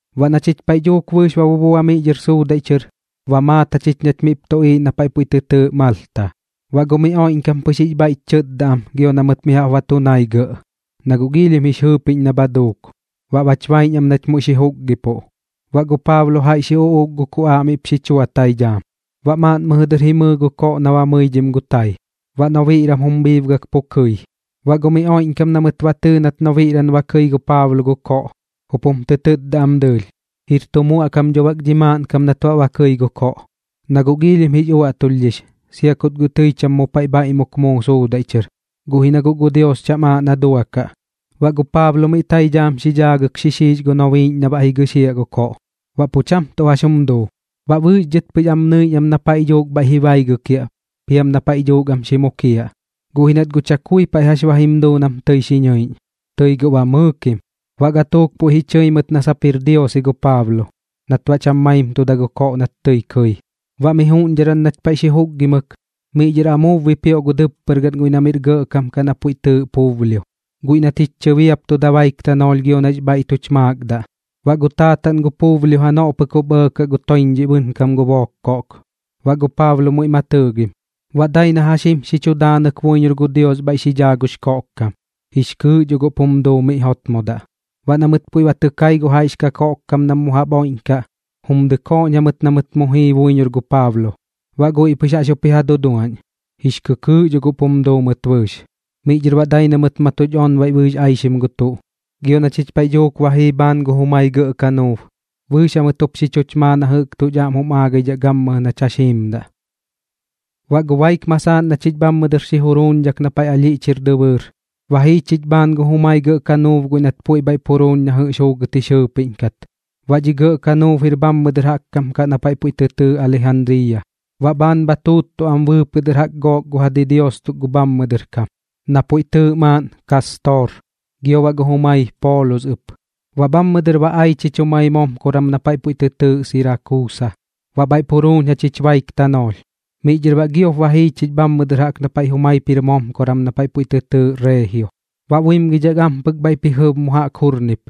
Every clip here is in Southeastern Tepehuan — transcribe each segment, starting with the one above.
Baꞌ na chich paiꞌ dhuuk bɨɨx ba bubua miꞌ dhɨr suudaiꞌ chɨr, ba maat jachich nach miꞌp tuꞌiiꞌ na paiꞌ puiꞌ tɨ tɨɨꞌ Malta. Baꞌ gu miꞌ oiꞌñkam pɨx jix bhaiꞌch chɨtda am gio na mɨt mi jaꞌp ba tu nai gɇꞌ, na guꞌ giilhim jix jɨɨpiꞌñ na bha duuk, baꞌ bach baiꞌñ am nach muiꞌ xi juukgipuꞌ. Baꞌ gu Paablo jaiꞌ xi uꞌuuk gu kuꞌaaꞌ miꞌp xi chua tai dhaam. Baꞌ maaꞌn mɨjɨ dɨr jimɨɨ gu koꞌ na ba mɨidhim gu tai, baꞌ nobiꞌran jum bhiibgak pu kɨi. Baꞌ gu miꞌ oiꞌñkam na mɨt tɨɨ nat nobiꞌran ba kɨi gu Paablo gu koꞌ, jup jum tɨ tɨtda am dɨɨlh: ―Jir tu muaꞌkam dho bak dhi maaꞌnkam nat baꞌ ba kɨi gu koꞌ, na guꞌ giilhim jix uaꞌtulhdhix, sia kut guꞌ tɨi cham mu paiꞌ bhaiꞌmuk muu suudaiꞌ chɨr. Guꞌ ji na guꞌ gu Dios cham aaꞌ na duakaꞌ. Baꞌ gu Paablo miꞌ tai dhaam xi dhaagɨk xixiix gu nobiiꞌñ na baꞌ jigɨxiaꞌ gu koꞌ, baꞌ pu cham tuꞌ jax jum duu. Baꞌ bɨɨx dhɨt pɨx am nɨiꞌñ am na paiꞌ dhuuk bhaiꞌ ji baigɨkiaꞌ piam na paiꞌ dhuuk am xi mukiaꞌ, guꞌ ji nat guꞌ chakui paiꞌ jax ba jim duu nam tɨi xi nɨiꞌñ, tɨi guꞌ ba mɨɨkim. Baꞌ gatuuk puiꞌ ji chɨi mɨt na sap jir dios ji gu Paablo, nat baꞌ cham maimtuda gu koꞌ nat tɨi kɨi. Baꞌ miꞌ juꞌñdharan nach paiꞌ xi juukgimɨk, miꞌ dhɨr amuub bipioꞌ gu dɨppɨr gaꞌn guiꞌ na miꞌr gɇꞌkam kaꞌ na puiꞌ tɨɨꞌ Publio, guiꞌ nat jich chɨbiaptuda baik tanoolh gio nax bhaiꞌ tuch maakdaꞌ. Baꞌ gu taataꞌn gu Publio janoꞌ pɨk jup ɇɇkaꞌ gu toiñdhiꞌ bɨnkam gu book koꞌk, baꞌ gu Paablo muiꞌ ma tɨɨgim. Baꞌ dai na jax jim xi chu daanɨk buiñor gu Dios bhaiꞌ xi dhaa gux koꞌkkam, jix kɨɨꞌ dho guꞌp jum duu miꞌ jotmodaꞌ. Baꞌ na mɨt puiꞌ ba tɨ kai gu jaiꞌx kakoꞌkkam nam mu jaꞌp oiꞌñkaꞌ, jum dɨkooꞌñ jamɨt na mɨt mu jii buiñor gu Paablo. Baꞌ guiꞌ pɨx jaꞌx jup ji ja duduaꞌñ, jix kɨkɨɨꞌ dho guꞌp jum duu mɨt bɨɨx. Miꞌ dhɨr baꞌ dai na mɨt ma tuch onbaiꞌ bɨɨx aixim gu tuꞌ, gio na chich paiꞌ dhuuk ba jii bhaan gu jumai gɇꞌ kanuub bɨɨx jamɨt jup xi chuch maa na jɨꞌk tuꞌch aꞌm jum aagaidhaꞌ gammɨjɨ nach jax jiimdaꞌ. Baꞌ gu baik masaaꞌn na chich bhammɨ dɨr xi juruuñdhak na paiꞌ ɨlhiꞌch jir dɨbɨɨr, ba jii chich bhaan gu jumai gɇꞌ kanuub guiꞌ nat puiꞌ bhaiꞌp juruuñ na jɨꞌx juugɨt jix jɨɨpiꞌñ kat. Baꞌ dhi gɇꞌ kanuub jir bhammɨ dɨr jaꞌk kam kaꞌ na paiꞌ puiꞌ tɨ tɨɨꞌ Alijandriiya, baꞌ bhaan bha tuuttuꞌ am bɨɨpɨꞌ dɨr jaꞌk gook gu ja didios tuk gu bhammɨ dɨr kam, na puiꞌ tɨɨꞌ maaꞌn Kaastor, gio baꞌ gu jumai Poolus ɨp. Baꞌ bhammɨ dɨr ba ai chich jumai momkoran na paiꞌ puiꞌ tɨ tɨɨꞌ Sirakuusa, baꞌ bhaiꞌp juruuñ jachich baik tanoolh. Miꞌ dhɨr baꞌ giop ba jii chich bhammɨ dɨr jaꞌk na paiꞌ jumaip jir momkoran na puiꞌ tɨ tɨɨꞌ Reegio. Baꞌ buimgidhak ampɨk bhaiꞌp ji jɨb mu dɨr jaꞌk jurnip,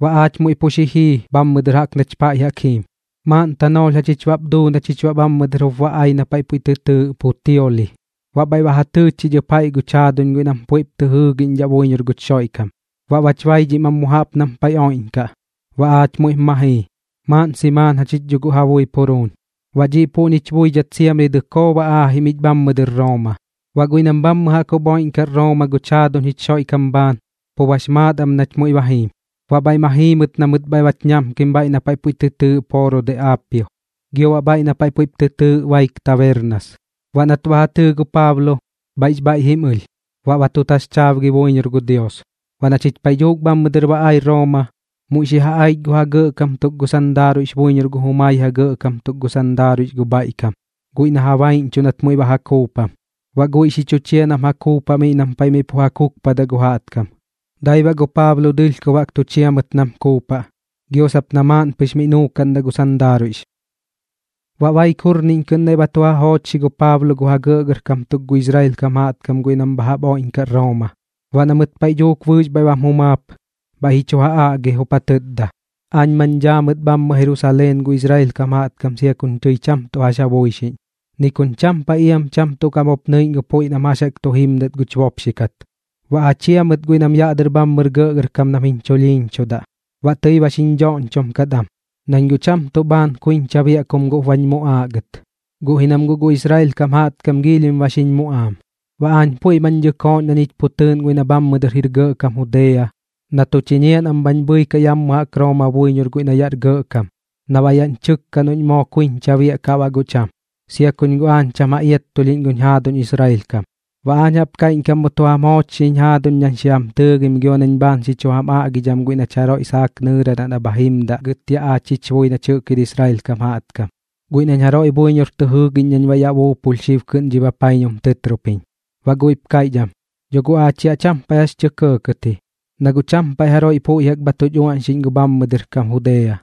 baꞌ aach muiꞌ pu xi jii bhammɨ dɨr jaꞌk nach paiꞌ jaꞌk jiim, maaꞌn tanoolh jachich baꞌp duu na chich baꞌ bhammɨ dɨr jup ba ai na paiꞌ puiꞌ tɨ tɨɨꞌ Putioli. Baꞌ bhaiꞌ ba ja tɨɨ chich ɨp jaiꞌ guch jaaduñ guiꞌ nam puiꞌp tɨ jɨɨgiꞌñdhaꞌ buiñor guch Xoiꞌkam. Baꞌ bach baidhim am mu jaꞌp nam paiꞌ oiꞌñkaꞌ, baꞌ aach muiꞌp ma jii, maaꞌn simaan jachich dho guꞌ ja buip juruuñ. Baꞌ dhiꞌ puꞌñich buidhat siamri dɨkoo ba aajim ich bhammɨ dɨr Rooma. Baꞌ guiꞌ nam bhammɨ jaꞌk jup oiꞌñkaꞌ Rooma guch jaaduñ jich Xoiꞌkam bhaan, pu bax maat am nach muiꞌ ba jiim, baꞌ bhaiꞌ ma jii mɨt na mɨt bhach ñamkim bhaiꞌ na paiꞌ puiꞌ tɨ tɨɨꞌ Pooro de Aapio, gio baꞌ bhaiꞌ na paiꞌ puiꞌp tɨ tɨɨꞌ Baik Tabernas. Baꞌ nat ba ja tɨɨ gu Paablo, bhaiꞌx bhaiꞌ jim ɨlh, baꞌ ma tu taxchaabgi buiñor gu Dios. Baꞌ na chich paiꞌ dhuuk bhammɨ dɨr ba ai Rooma, muiꞌ xi ja aich gu ja gɇꞌkam tuk gu sandaaruiꞌx buiñor gu jumai ja gɇꞌkam tuk gu sandaaruiꞌx gu bhaiꞌ kam, guiꞌ na ja baiꞌñchuꞌ nat muiꞌ ba ja kuupam. Baꞌ guiꞌ xi chu chia nam ja kuupaꞌ miꞌ nam paiꞌ miꞌ pu ja kukpadaꞌ gu jaꞌtkam. Dai baꞌ gu Paablo dɨlhkob jaꞌk tu chia mɨt nam kuupaꞌ, gio sap na maaꞌn pɨx miꞌ nuukaꞌndaꞌ gu sandaaruiꞌx. Baꞌ baik jurniꞌñ kɨꞌn naiꞌ ba tu ja joochxi gu Paablo gu ja gɇꞌgɇrkam tuk gu Israel kam jaꞌtkam guiꞌ nam bha jaꞌp oiꞌñkaꞌ Rooma. Baꞌ na mɨt paiꞌ dhuuk bɨɨx bhaiꞌ bam jumaap, bhaiꞌ ji chu ja aꞌgi, jup ja tɨtda: ―Aañ mañ dhaa mɨt bhammɨ Jerusaleen gu Israel kam jaꞌtkam sia kuñ tɨi cham tuꞌ jax ja buixiꞌñ, ni kuñ cham paiꞌ iam cham tuꞌ kaꞌm jup nɨiꞌñ gu puiꞌ nam jax jaꞌk tu jimdat guch bopxi kat, baꞌ ja chia mɨt guiꞌ nam yaꞌ dɨr bhammɨr gɇꞌgɇrkam nam jiñ chulhiiñchudaꞌ. Baꞌ tɨi ba xiñ dhoꞌñchom kat am, nañ guꞌ cham tuꞌ bhaan kuiñcha biaꞌ kum guꞌp bañ muꞌaaꞌ gɨt. Guꞌ ji nam guꞌ gu Israel kam jaꞌtkam giilhim ba xiñ muꞌaam, baꞌ aañ puiꞌ mañ dɨkooꞌñ na ñich pu tɨɨꞌn guiꞌ na bhammɨ dɨr jir gɇꞌkam Judea na tu chiñiaꞌ nam bhañ bhɨikaꞌ ya jaꞌk Rooma buiñor guiꞌ na yaꞌr gɇꞌkam na baꞌ yaꞌñ chɨkkaꞌ noꞌñ moo kuiñcha biaꞌkaꞌ baꞌ guꞌ cham, sia kuñ guꞌ aañ cham ja iattulhdham guñ jaaduñ Israel kam. Baꞌ aañ jaꞌp kaiꞌñkam mu tu jam joochxiñ jaaduñ nañ xi jam tɨɨgim gio nañ bhaan xi chu jam aꞌgidham guiꞌ nach jaroiꞌ saak nɨɨradaꞌ na bha jimdaꞌ gɨt yaꞌ aach jich bui nach jɨꞌk jir Israel kam jaꞌtkam, guiꞌ nañ jaroiꞌ buiñor tɨ jɨɨgiꞌñ nañ baꞌ yaꞌ buupulh xib kɨꞌn dhi bapaiñum tɨtropiñ. Baꞌ guiꞌp kaiꞌch am: ―Dho guꞌ aach yaꞌ cham paiꞌ jax tɇ kɇɇ ji, na guꞌ cham paiꞌ jaroiꞌ puiꞌ jaꞌk bha tuch uaꞌñxiꞌñ gu bhammɨ dɨr kam Judea,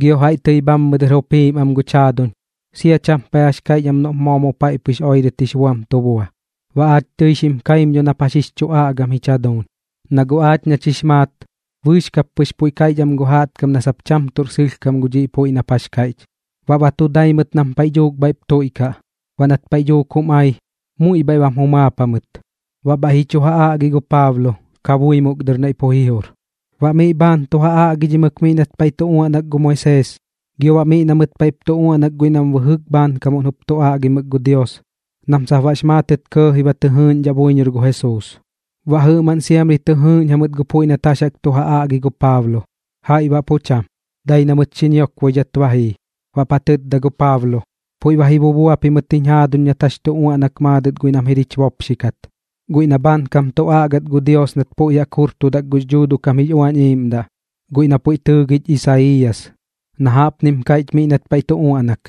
gio jaiꞌ tɨi bhammɨ dɨr jup jiim am guch jaaduñ, sia cham paiꞌ jax kaiꞌch am noꞌp moo mu paiꞌ pɨx oirɨt jix buam tu bua. Baꞌ aach tɨi xim kaim dho gu puiꞌ nap jax jix chu aꞌgam jich jaduuñ, na guꞌ aach nach jix maat, bɨɨx kap pɨx puiꞌ kaiꞌch am gu jaꞌtkam na sap cham tuꞌr sɨlhkam gu dhiꞌ puiꞌ nap jax kaiꞌch. Baꞌ ba tu dai mɨt nam paiꞌ dhuuk bhaiꞌp tuiꞌkaꞌ. Baꞌ nat paiꞌ dhuuk jum ai, muiꞌ bhaiꞌ bam jumaap jamɨt, baꞌ bhaiꞌ ji chu ja aꞌgi gu Paablo kabuimuk dɨr pu naiꞌ ji jur. Baꞌ miꞌ bhaan tu ja aꞌgidhimɨk miꞌ nat paiꞌ tu uaꞌnak gu Moisees gio baꞌ miꞌ na mɨt paiꞌp tu uaꞌnak guiꞌ nam puiꞌ bɨjɨk bhaankamuꞌn jup tu aꞌgimɨk gu Dios nam sap baꞌx maatɨt kɇɇji ba tɨ jɨɨꞌñdhaꞌ buiñor gu Jesuus. Baꞌ jɨꞌmaꞌn siamri tɨ jɨɨꞌñ jamɨt gu puiꞌ nat jax jaꞌk tu ja aꞌgi gu Paablo, jaiꞌ baꞌ pu cham, dai na mɨt xi ñiokboidhat ba jii. Baꞌp ja tɨtda gu Paablo: ―Puiꞌ ba ji bubua pimɨt jiñ jaaduñ nat jax tu uaꞌnak maadɨt guiꞌ nam jir jich bopxi kat, guiꞌ nam bhaankam tu aꞌgat gu Dios nat puiꞌ jaꞌk jurtudak gux Dhuuduꞌ kam jix Uañ Iiꞌmdaꞌ, guiꞌ na puiꞌ tɨɨgich Isaiiyas, na jaꞌpnim kaiꞌch miꞌ nat paiꞌ tu uaꞌnak: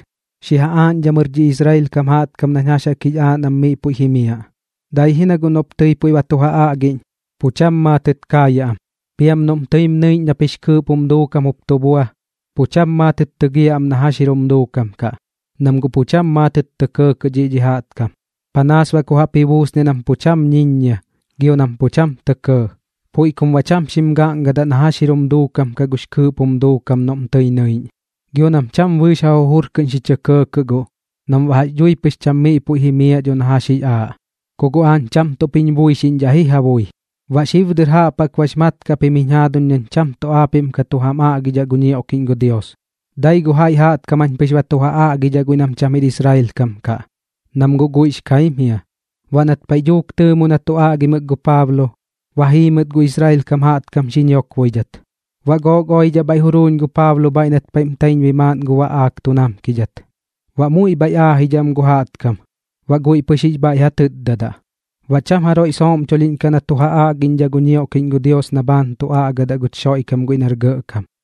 Xi ja aaꞌñdhamɨr dhi Israel kam jaꞌtkam nañ jax jaꞌk jix aaꞌ nam miꞌ puiꞌ jimiaꞌ. Dai ji na guꞌ noꞌp tɨi puiꞌ ba tu ja aꞌgiꞌñ, pu cham maatɨt kaayaꞌ am, piam noꞌm tɨim nɨiꞌñ nap jix kɨɨꞌp jum duukam jup tu bua, pu cham maatɨt tɨgiaꞌ am na jax jir jum duukam kaꞌ. Nam guꞌ pu cham maatɨt tɇ kɇɇ dhiꞌ dhi jaꞌtkam, panaas baꞌ ku jaꞌp ji buusan nam pu cham ñiññia gio nam pu cham tɇ kɇɇ. Puiꞌ kum baꞌ cham xim gaꞌngadaꞌ na jax jir jum duukam kaꞌ gux kɨɨꞌp jum duukam noꞌm tɨi nɨiꞌñ, gio nam cham bɨɨx ja jujur kɨꞌn xi chɇ kɇɇkɇꞌ guꞌ nam baꞌ jax dhui pɨx cham miꞌ puiꞌ jimiaꞌ dho nañ jax jix aaꞌ. Ku guꞌ aañ cham tuꞌp jiñ buixiꞌñdhaꞌ ji ja bui. Baꞌ xib dɨr jaꞌp jaꞌk bax mat kaꞌ pim jiñ jaaduñ nañ cham tuꞌ aapiꞌm ka tu jam aꞌgidhaꞌ gu ñioꞌkiꞌñ gu Dios, dai gu jaiꞌ jaꞌtkam jañ pɨx ba tu ja aꞌgidhaꞌ guiꞌ nam cham jir Israel kam kaꞌ, nam guꞌ guiꞌx kaim jia. Baꞌ nat paiꞌ dhuuk tɨɨmu na tu aꞌgimɨk gu Paablo, ba jii mɨt gu Israel kam jaꞌtkam xi ñiokboidhat. Baꞌ gook oidhaꞌ bhaiꞌ juruuñ gu Paablo bhaiꞌ nat paiꞌm taiñbui maaꞌn gu baꞌaak tu namkidhat. Baꞌ muiꞌ bhaiꞌ aajidhaꞌ am gu jaꞌtkam, baꞌ guiꞌ pɨx jix bhaiꞌ ja tɨtdadaꞌ. Baꞌ cham jaroiꞌ sooꞌmchulhiꞌñkaꞌ na tu ja aꞌgiꞌñdhaꞌ gu ñioꞌkiꞌñ gu Dios na bhaan tu aꞌgadaꞌ guch Xoiꞌkam guiꞌ nar Gɇꞌkam.